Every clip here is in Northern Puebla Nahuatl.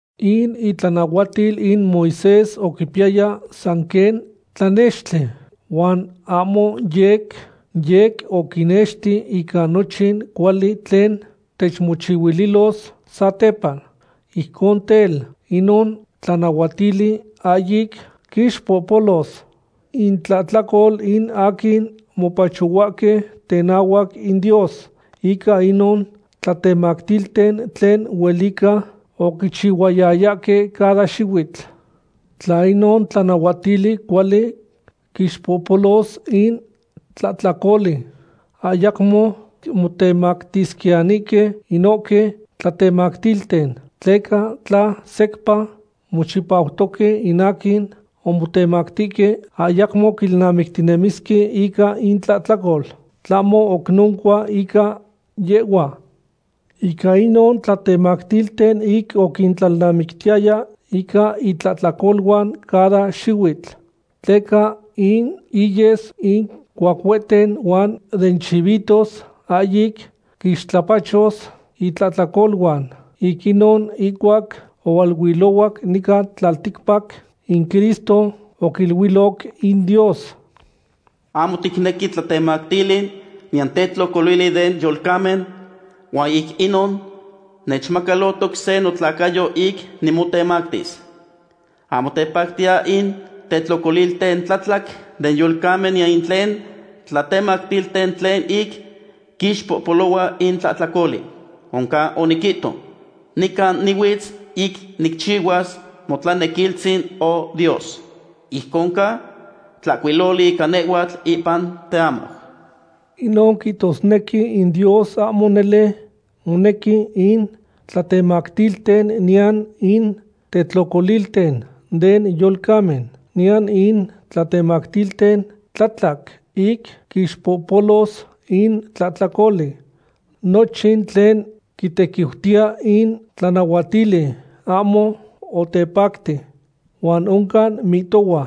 In itlanahuatil in Moisés oquipiyaya san quen tlanextli, huan ahmo yec yec oquinexti ica nochin cuali tlen techmochihuililos satepa. Ijcon tel, inon tlanahuatili ahyic quixpohpolos intlahtlacol in aquin mopachohuahque tenahuac in Dios ica inon tlatemactilten tlen huelica oquichihuayayahque cada xihuitl. Tla inon tlanahuatili cuali quixpohpolos in tlahtlacoli, ayacmo motemactisquiyanihque inohque tlatemactilten, tleca tla secpa mochipautoque in aquin omotemactihque, ayacmo quilnamictinemisque ica intlahtlacol. Tlahmo oc noncua ica yehhuan. Ica inon tlatemactilten ic oquintlalnamictiyaya ica intlahtlacoluan cada xihuitl, tleca in iyes in cuacueten huan den chivitos ahyic quixtlapachos intlahtlacoluan. Ic inon, ihcuac ohualuilohuac nican tlalticpac, in Cristo oquiluiloc in Dios: Ahmo ticnequi tlatemactili niyan tetlocolili den yolcamen, huan ic inon nechmacalohtoc se notlacayo ic nimotemactis. Ahmo tepactiya in tetlocolilten tlatlac den yolcamen niyan in tlen tlatemactilten tlen ic quixpohpolohua in tlahtlacoli. Oncan oniquihto: “Nican nihuitz ic nicchihuas motlanequilistzin, O Dios, ijcon ca tlahcuiloli ica nehhuatl ipan teamau.” Inon quihtosnequi in Dios ahmo nele monequi in tlatemactilten niyan in tetlocolilten den yolcamen, niyan in tlatemactilten tlatlac ic quixpohpolos in tlahtlacoli. Nochin tlen quitequiutiya in tlanahuatili ahmo otepacti. Huan oncan mihtohua: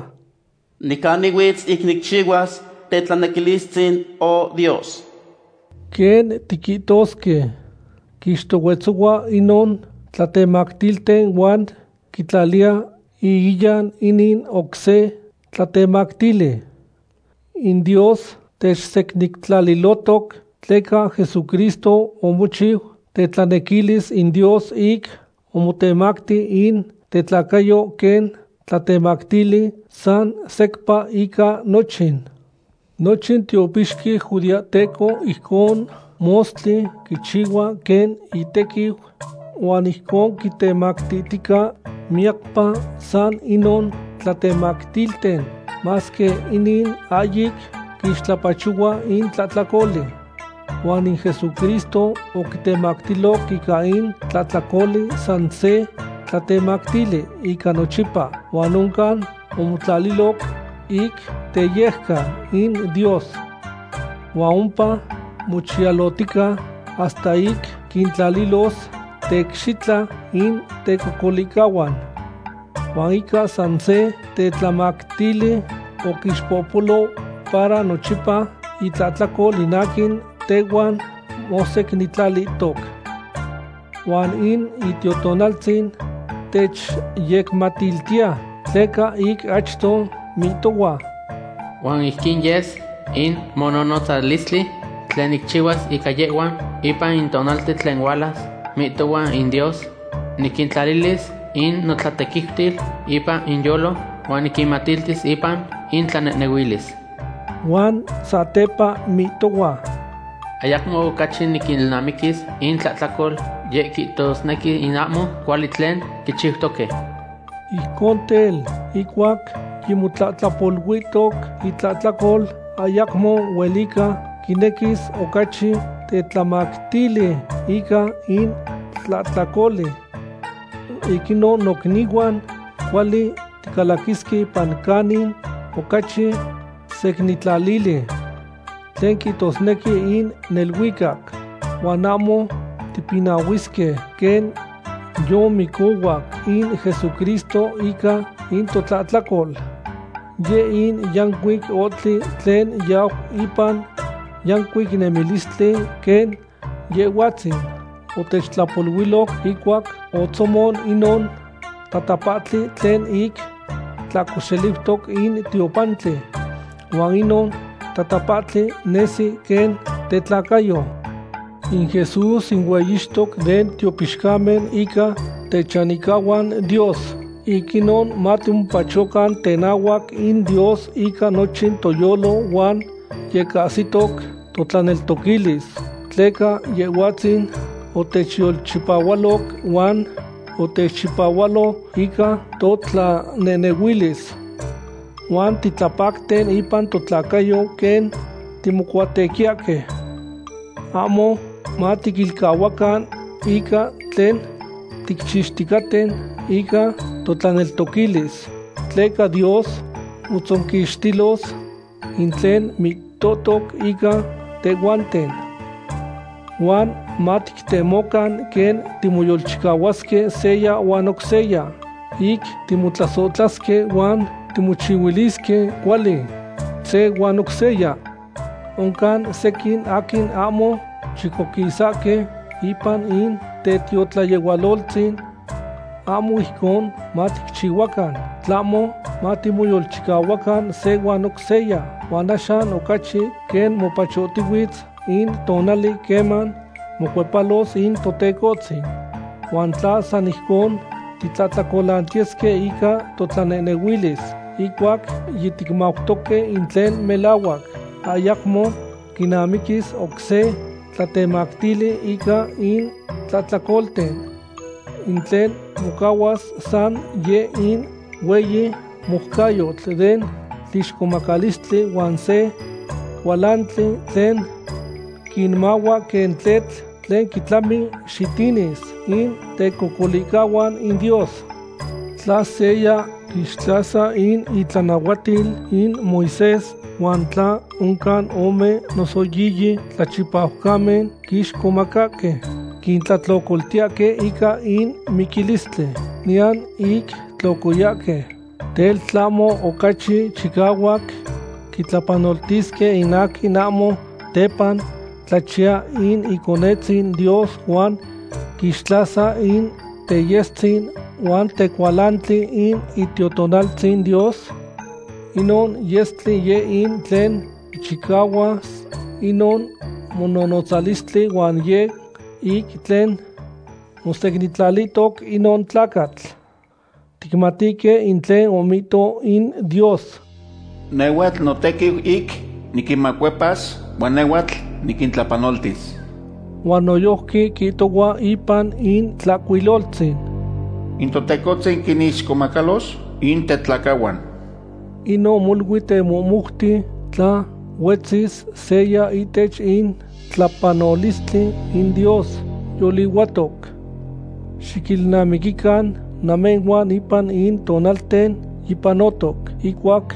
“Nican nihuitz ic nicchihuas tetlanequilistzin, O Dios.” Quen tiquihtosque, quixtohuetzohua inon tlatemactilten huan quitlaliya ihiyan inin oc se tlatemactili. In Dios techsecnintlalilohtoc tleca Jesucristo omochiu tetlanequilis in Dios ic omotemacti in tetlacayo quen tlatemactili san secpa ica nochin. Nochin tiopixqui judeahteco ijcon mostli quichihua quen itequiu, huan ijcon quitemactihtica miyacpa san inon tlatemactilten, masque inin ahyic quixtlapachohua in tlahtlacoli. Huan in Jesucristo oquitemactiloc ica in tlahtlacoli san se tlatemactili ica nochipa huan oncan omotlaliloc ic teyejcan in Dios. Huan ompa mochiyalohtica hasta ic quintlalilos teicxitla in tecocolihcahuan. Huan ica san se tetlamactili oquixpohpolo para nochipa itlahtlacol in aquin tehuan mosecnintlalihtoc. Huan in Itiotonaltzin techyecmatiltiya, tleca ic achto mihtohua: Huan ijquin yes in mononotzalistli tlen nicchihuas ica yehhuan ipan in tonalten tlen hualas, mihtohua in Dios: Niquintlalilis in notlatequiutil ipan inyolo huan niquinmatiltis ipan intlanehnehuilis. Huan satepa mihtohua: Ayacmo ocachi niquilnamiquis intlahtlacol, yeh quihtosnequi in ahmo cuali tlen quichiutoque. Ijcon tel, ihcuac yimotlahtlapoluihtoc intlahtlacol, ayacmo huelica quinequis ocachi tetlamactili ica in tlahtlacoli. Ic inon, nocnihuan, cuali ticalaquisque ipan canin ocachi secnintlalili, tlen quihtosnequi in neluicac. Huan ahmo tipinahuisque, quen yimocohuac in Jesucristo ica totlahtlacol. Yeh in yancuic ohtli tlen yau ipan yancuic nemilistli quen Yehhuatzin otechtlapoluiloc ihcuac otzomon inon tatapahtli tlen ic tlahcoxeliutoc in tiopantli, huan inon tatapahtli nesi quen tetlacayo. In Jesús in hueyixtoc den tiopixcamen ica techanihcahuan Dios. Ic inon matimopachocan tenahuac in Dios ica nochin toyolo huan yecahsitoc totlaneltoquilis, tleca Yehhuatzin otechyolchipahualoc huan otechchipahualo ica totlanehnehuilis. Huan titlapapacten ipan totlacayo quen timocuatequiyahque. Ahmo matiquilcahuacan ica tlen ticchixticaten ica totlaneltoquilis, tleca Dios motzonquixtilos in tlen mihtohtoc ica tehhuanten. Huan matictemocan quen timoyolchicahuasque seya huan oc seya ic timotlasohtlasque huan timochihuilisque cuali, se huan oc seya. Oncan sequin aquin ahmo chicoquisahque ipan in tetiotlayehualoltzin. Ahmo ijcon maticchihuacan, tlahmo matimoyolchicahuacan se huan oc seya, huan axan ocachi, quen mopachohtihuitz in tonali queman mocuepalos in Totecohtzin. Huan tla san ijcon titlahtlacolantiyesque ica totlanehnehuilis ihcuac yiticmautoque in tlen melahuac, ayacmo quinamiquis oc se tlatemactili ica in tlahtlacolten. In tlen mocahua san yeh in hueyi moucayotl den tlixcomacalistli huan se cualantli tlen quinmahua quen tletl tlen quitlami xitinis in tecocolihcahuan in Dios. Tla seya quixtlasa in itlanahuatil in Moisés huan tla oncan ome noso yiyi tlachipaucamen quixcomacahque, quitlahtlocoltiyahque ica in miquilistli, niyan ic tlocoyasque. Tel, ¿tlahmo ocachi chicahuac quitlapanoltisque in aquin ahmo tepa tlachiya in Iconetzin Dios huan quixtlasa in teyestzin huan tecualantli in Itiotonaltzin Dios? Inon yestli yeh in tlen quichicahuas inon mononotzalistli huan yeh ic tlen mosecnintlalihtoc inon tlacatl. Ticmatihque in tlen omihto in Dios: “Nehhuatl notequiu ic niquinmacuepas, huan nehhuatl niquintlapanoltis.” Huan noyojqui quihtohua ipan in Tlahcuiloltzin: “In Totecohtzin quinixcomacalos in tetlacahuan.” Inon molui temohmoute tla huetzis seya ihtech in tlapanolistli in Dios yolihuatoc. Xiquilnamiquican namehhuan ipan in tonalten yipanotoc ihcuac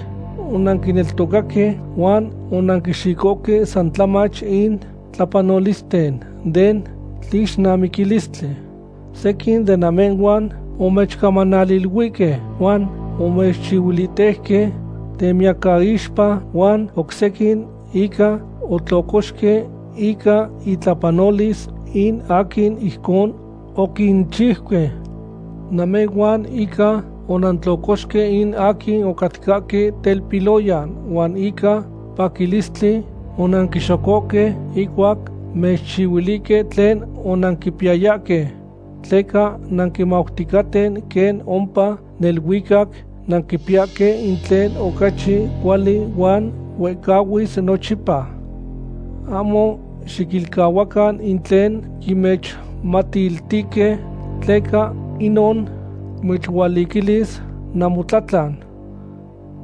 onanquineltocaque, huan onanquixicohque san tlamach in tlapanolisten den tlixnamiquilistli. Sequin de namehhuan omechcamanaliluihque huan omechuihhuitejque temiyacaixpa, huan oc sequin inca otlocoxque ica intlapanolis in aquin ijcon oquinchiuque. Namehhuan inca onantlocoxque in aquin ocatcahque telpiloyan, huan ica paquilistli onanquixocohque ihcuac mechcuilihque tlen onanquipiyayahque. Tleca nanquimauticaten quen ompa neluicac nanquipiyahque in tlen ocachi cuali huan huehcahuis nochipa. Ahmo xiquilcahuacan in tlen yimechmatiltihque, tleca inon mechualiquilis namotlatlan.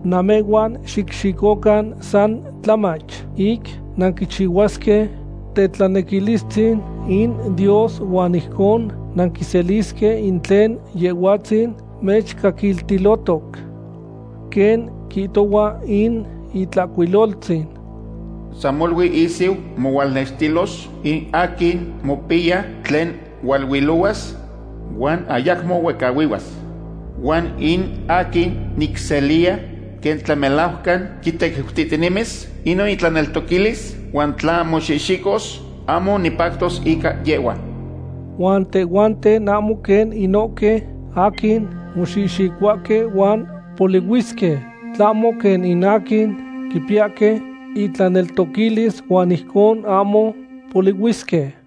Namehhuan xicxicocan san tlamach ic nanquichihuasque tetlanequilistzin in Dios huan ijcon nanquiselisque in tlen Yehhuatzin mechcaquiltilotoc. Quen quihtohua in Itlahcuiloltzin: San molui ihsiu mohualnextilos in aquin mopiya tlen hualuilohuas huan ayacmo huehcahuihuas. Huan in aquin nicseliya quen tlamelajcan quitequiutihtinemis inon itlaneltoquilis huan tla moxihxicos, ahmo nipactos ica yehhua. Huan tehhuanten ahmo quen inohque aquin moxihxicohuahque huan polihuisque, tlahmo quen in aquin quipiyahque intlaneltoquilis huan ijcon ahmo polihuisque.